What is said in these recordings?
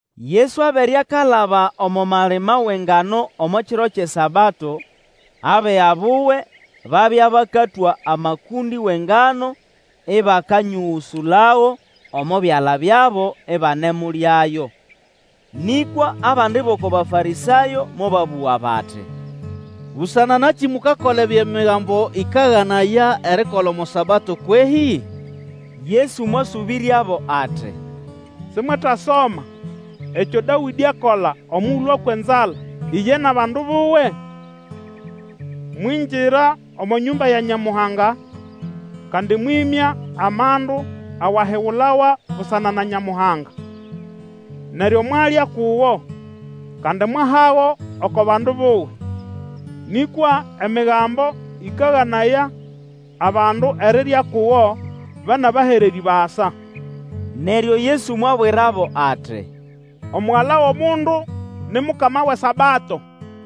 Yesu abere akalaba omo malima wʼengano omo kiro kyʼeSabato. Abiga buwe babya bakatwa amakũndĩ wʼengano ĩbakanyũgũsũlago omo byala byabo ibanemulyayo. Nĩkwa abandi bʼoko Bafarĩsayo mobabũga bati, Busana nakĩ mukakola ebyo Migambo ĩkaganaya erikola omo Sabato kwehĩ? Yesu mwasũbĩryabo ati, Simwetasoma ekyo Dawĩdĩ akola omugulu akwa enzala, iye nʼabandu buwe? Mwingira omo nyũmba ya Nyamuhanga, kandi mwĩmya amandu awahigulawa busana na Nyamuhanga. Neryo mwalya kugo, kandi mwahago oko bandu buwe. Nĩkwa Emigambo ĩkaganaya abandu erirya kugo, ba nʼabahererĩ basa. Neryo Yesu mwabwirabo ati, Omugala wʼomundu ni Mukama wʼeSabato.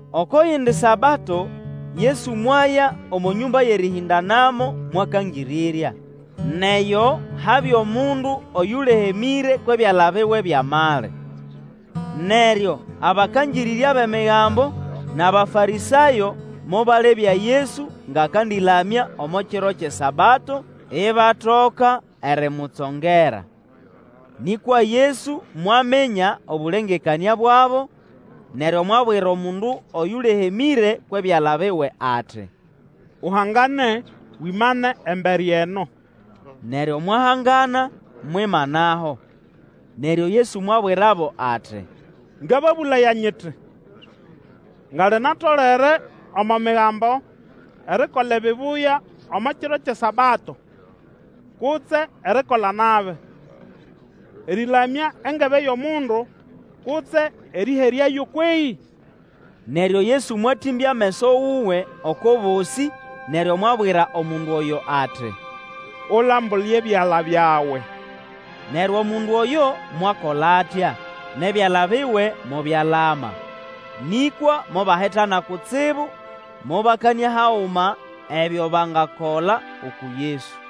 Oko yindi Sabato Yesu mwaya omo nyũmba yʼerĩhĩndanamo mwakangĩrĩrya. Nʼeyo habya omundu oyũlehemĩre kwʼebyala biwe byʼamali. Neryo abakangĩrĩrya bʼEmigambo nʼAbafarĩsayo mobalebya Yesu ngʼakandĩlamya omo kiro kyʼeSabato, ibatoka erimutsongera. Nĩkwa Yesu mwaminya obũlengekanĩa bwabo, neryo mwabwira omundu oyũlehemĩre kwʼebyala biwe ati, Uhangane, wimane embere eno. Neryo mwahangana, mwimanaho. Neryo Yesu mwabwirabo ati, Ngababũlaya nyiti, nga linatolere omo Migambo erikola ebibuya omo kiro kyʼeSabato, kutse erikola nabi, erĩlamya engebe yʼomundu, kutse erĩheryayo kwehĩ? Neryo Yesu mwatĩmbya ameso wuwe oko bosĩ, neryo mwabwira omundu oyo ati, Ulambule ebyala byawe, Neryo omundu oyo mwakola atya, nʼebyala biwe mobyalama. Nĩkwa mobahitana kutsibu, mobakanĩa haguma ebyo bangakola uku Yesu.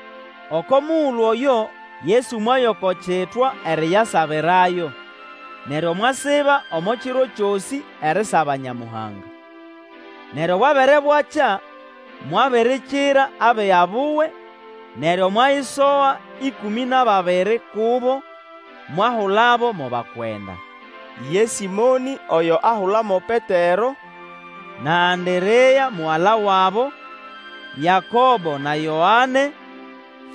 Oko mugulu oyo Yesu mwaya oko kitwa eriyasabirayo, neryo mwasiba omo kiro kyosĩ erisaba Nyamuhanga. Neryo bwabere bwakya, mwabirikira abiga buwe, neryo mwayisoga ĩkũmĩ nʼababiri kubo, mwahulabo mo bakwenda. Ye Sĩmonĩ, oyo ahula mo Petero, na Anderea mugala wabo; Yakobo na Yoane;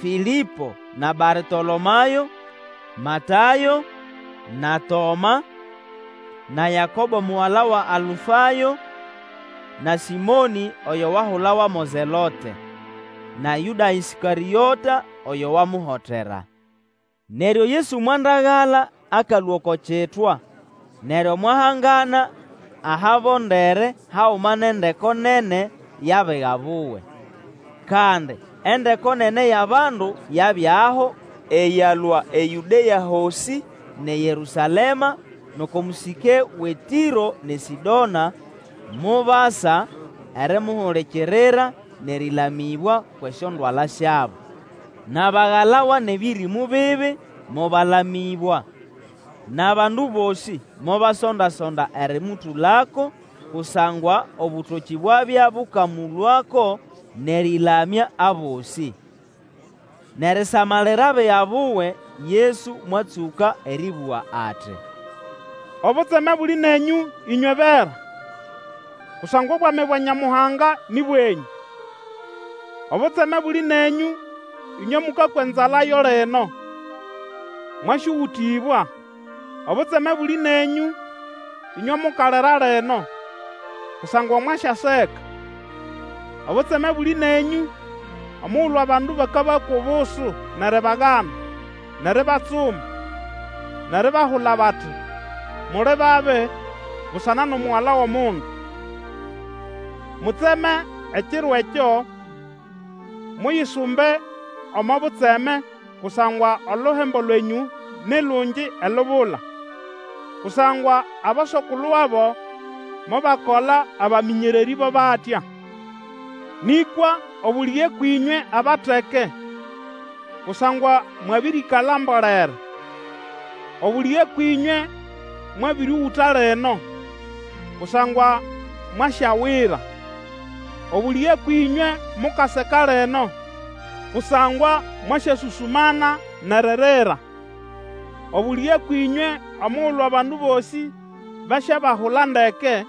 Fĩlĩpo na Bartolomayo; Matayo; na Toma; na Yakobo mugala wa Alufayo, na Sĩmonĩ oyo wahulawa mo Zelote; na Yũda Ĩskarĩota, oyo wamuhotera. Neryo Yesu mwandagala akalũa oko kitwa, neryo mwahangana ahabondere haguma nʼendeko nene yʼabiga buwe. Kandi endeko nene yʼabandu yabyaho eyalũa eYũdea hosĩ, nʼeYerũsalema, nʼoko mũsĩke wʼeTĩro nʼeSĩdona, mobasa erimuhulikirira, nʼerĩlamĩbwa kwʼesyondwala syabo. Nʼabagalawa nʼebĩrĩmũ bibi, mobalamĩbwa. Nʼabandu bosĩ mobasonda-sonda erĩmũtũlako, kusangwa obũtokĩ bwabya bũkamũlũako nʼerĩlamya abosĩ. Nʼerisamalira abiga buwe, Yesu mwatsũka erĩbũga ati, Obutseme buli nenyũ ĩnywe bera, Kusangwa obwami bwa Nyamuhanga nĩ bwenyũ! Obutseme buli nenyũ ĩnywe mũkakwa enzala yo lino, Mwasyũgũtĩbwa! Obutseme buli nenyũ ĩnywe mukalira lino, kusangwa mwasyaseka! Obutseme buli nenyũ omugulu abandu bakabakwa obusu, nʼeribagana, nʼeribatsuma, nʼeribahula bati, Muli babi, busana nʼomugala wʼOmundu! Mutseme ekiro ekyo, muyisumbe omo butseme, kusangwa, oluhembo lwenyũ ni lungi elubula; kusangwa aboso-kulu wabo mobakola abamĩnyererĩ bo batya. Nĩkwa obũlĩge kwĩnywe abateke, kusangwa mwabĩrĩkala mbolere! Obũlĩge kwĩnywe mwabĩrĩũgũta lino, kusangwa mwasyawira! Obũlĩge kwĩnywe mukaseka lino, kusangwa mwasyasũsũmana nʼeririra! Obũlĩge kwĩnywe omugulu abandu bosĩ basyabahula ndeke,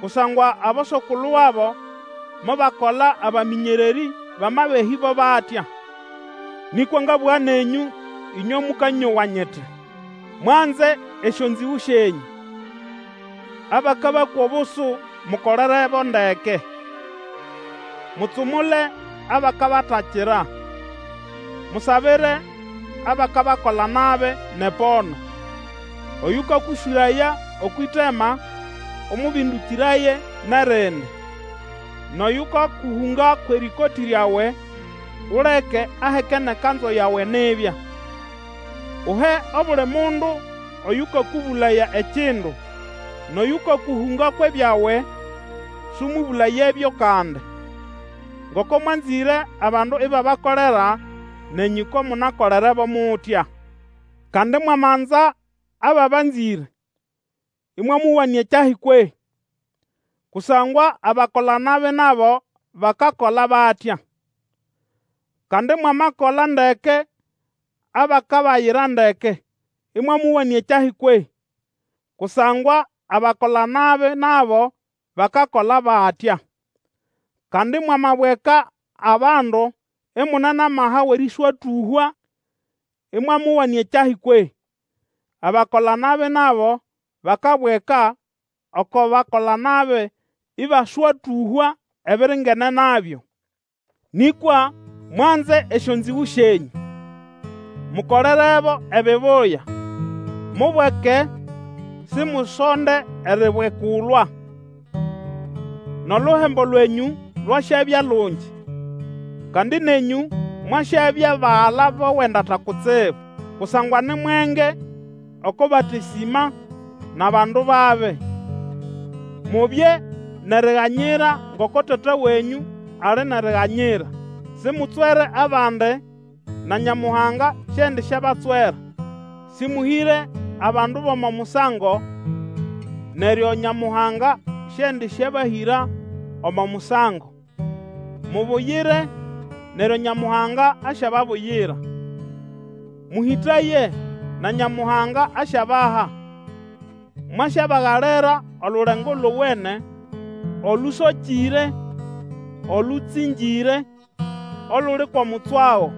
kusangwa aboso-kulu wabo mobakola abamĩnyererĩ bʼamabehĩ bo batya. Nĩkwa ngabũga nenyũ ĩnywe mũkanyowa nyiti, Mwanze esyonzĩgũ syenyũ, abakabakwa obusu mukolerebo ndeke. Mutsumule abakabatakira, musabire abakabakola nabi nʼepono. Oyũkakũswĩraya okwʼĩtema, ũmũbĩndũkĩraye nʼerindi; nʼoyũkakũhũnga kwʼerĩkotĩ ryawe, uleke aheke nʼekanzu yawe nibya. Uhe obuli mundu oyũkakũbũlaya ekindu, nʼoyũkakũhũnga kwʼebyawe, sũmũbũlayebyo kandi. Ngoko mwanzĩre abandu ibabakolera, nenyũ ko munakolerebo mutya. Kandi mwamanza ababanzĩre, ĩmwamowanĩa kyahĩ kwehĩ? Kusangwa abakola-nabi nabo bakakola batya. Kandi mwamakola ndeke abakabayira ndeke, ĩmwamowanĩa kyahi kwehĩ? Kusangwa abakola nabi nabo bakakola batya. Kandi mwamabweka abandu imune nʼamaha wʼerĩswatũhwa, ĩmwamowanĩa kyahi kwehĩ? Abakola-nabi nabo bakabweka oko bakola-nabi ĩbaswatũhwa ebiringene nabyo. Nĩkwa mwanze esyonzĩgũ syenyũ, mokolerebo ebibuya, mubweke, simusonde eribwekulwa. Nʼoluhembo lwenyũ lwasyabya lungi, kandi nenyũ mwasyabya bagala bʼOwendata Kutsibu; kusangwa ni mwenge oko batesĩma nʼabandu babi. Mubye nʼeriganyira ngoko Tata wenyũ ali nʼeriganyira. Simutswere abandi, na Nyamuhanga siendisyabatswera; sĩmũhĩre abandu bʼomo musango, neryo Nyamuhanga siendisyabahĩra omo musango; mubuyire, neryo Nyamuhanga asyababuyira. Mũhĩtaye, na Nyamuhanga asyabaha, mwasyabagalira olulengo lowene, olũsokĩre, olũtsĩngĩre, oluli kwʼomutswago.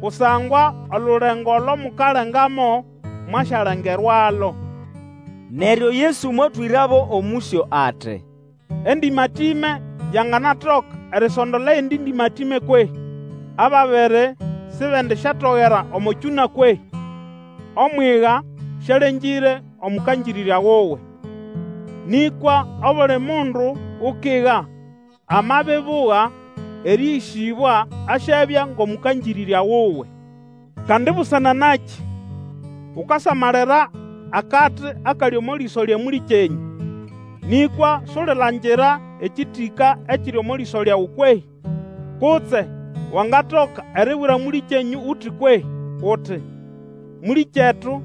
Kusangwa olulengo olo mukalengamo, mwasyalengerwalo. Neryo Yesu mwatwĩrabo omũsyo ati, Endĩmatĩme yanganatoka erisondola eyindi ndĩmatĩme kwehĩ? Ababiri sibendisyatogera omo kyũna kwehĩ? Omwiga sĩalengĩre omũkangĩrĩrga wuwe; nĩkwa obuli mundu ukiga amabibuga erĩĩgĩsĩbwa asyabya ngʼomũkangĩrĩrya wuwe. Kandi busana nakĩ ukasamalira akati akali omo lĩso lya mũlĩkyenyũ, nĩkwa sulilangira ekĩtĩka ekiri omo lĩso lyawe kwehĩ? Kutse wangatoka eribwira mũlĩkyenyũ uti kwehĩ? Uti, Mũlĩkyetu,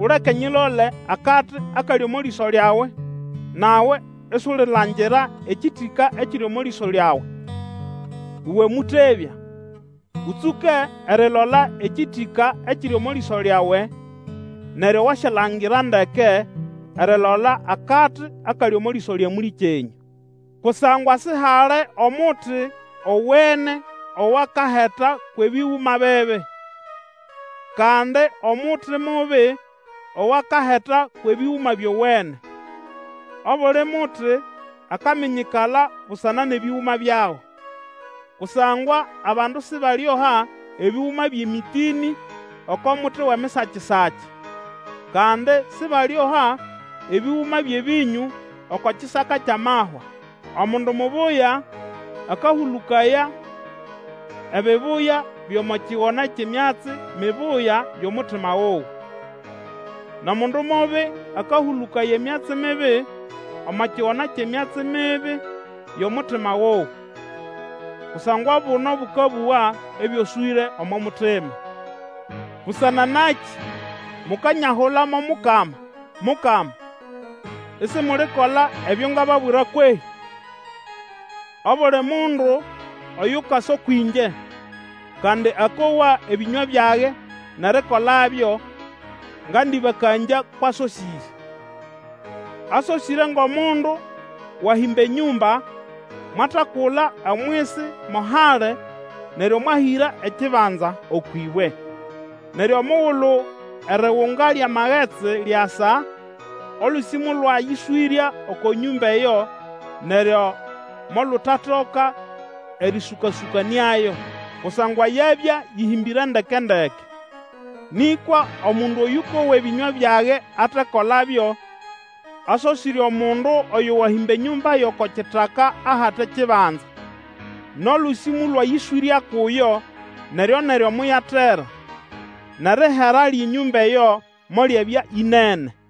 uleke nyilole akati akali omo lĩso lyawe, nawe isulilangira ekĩtĩka ekiri omo lĩso lyawe. Uwe mũtebya, Ũtsũke erilola ekĩtĩka ekiri omo lĩso lyawe, neryo wasyalangira ndeke erilola akati akali omo lĩso lya mũlĩkyenyũ. Kusangwa sihali omuti owene owakaheta kwʼebĩgũma bibi, kandi omuti mubi owakaheta kwʼebĩgũma byowene. Obuli muti akaminyikala busana nʼebĩgũma byago. Kusangwa abandu sibalioha ebĩgũma byʼemĩtĩnĩ oko muti wʼemisakisaki, kandi sibalioha ebĩgũma byʼebĩnyũ oko kisaka kyʼamahwa. Omundu mubuya akahũlũkaya ebibuya byʼomo kigona kyʼemyatsi mibuya vʼomutima wuwe; nʼomundu mubi akahũlũkaya emyatsi mibi omo kigona kyʼemyatsi mibi yʼomutima wuwe. Kusangwa obuno bũkabũga ebyoswĩre omo mutima. Busana nakĩ mukanyahula mo Mukama, Mukama, isimulikola ebyo ngababwira kwehĩ? Obuli mundu oyukasa kwĩngye, kandi akowa ebĩnywa byage nʼerikolabyo ngandĩbakangya kwʼasosĩre. Asosĩre ngʼomundu wahĩmba enyũmba: mwatakula omwisi mo hali neryo mwahĩra ekibanza okwʼĩbwe. Neryo omugulu erigunga lyʼamagetsi lyasa, olũsĩ molwayĩswĩrya oko nyũmba eyo neryo molutatoka erĩsũka-sũkanĩayo, kusangwa yabya yĩhĩmbĩre ndeke-ndeke. Nĩkwa omundu oyũkowa ebĩnywa byage atekolabyo, asosĩre omundu oyo wahĩmba enyũmba yʼoko kitaka ahate kibanza; nʼolũsĩ molwayĩswĩrya kuyo, neryo-neryo moyatera, nʼerihera lyʼenyũmba eyo molyabya ĩnene.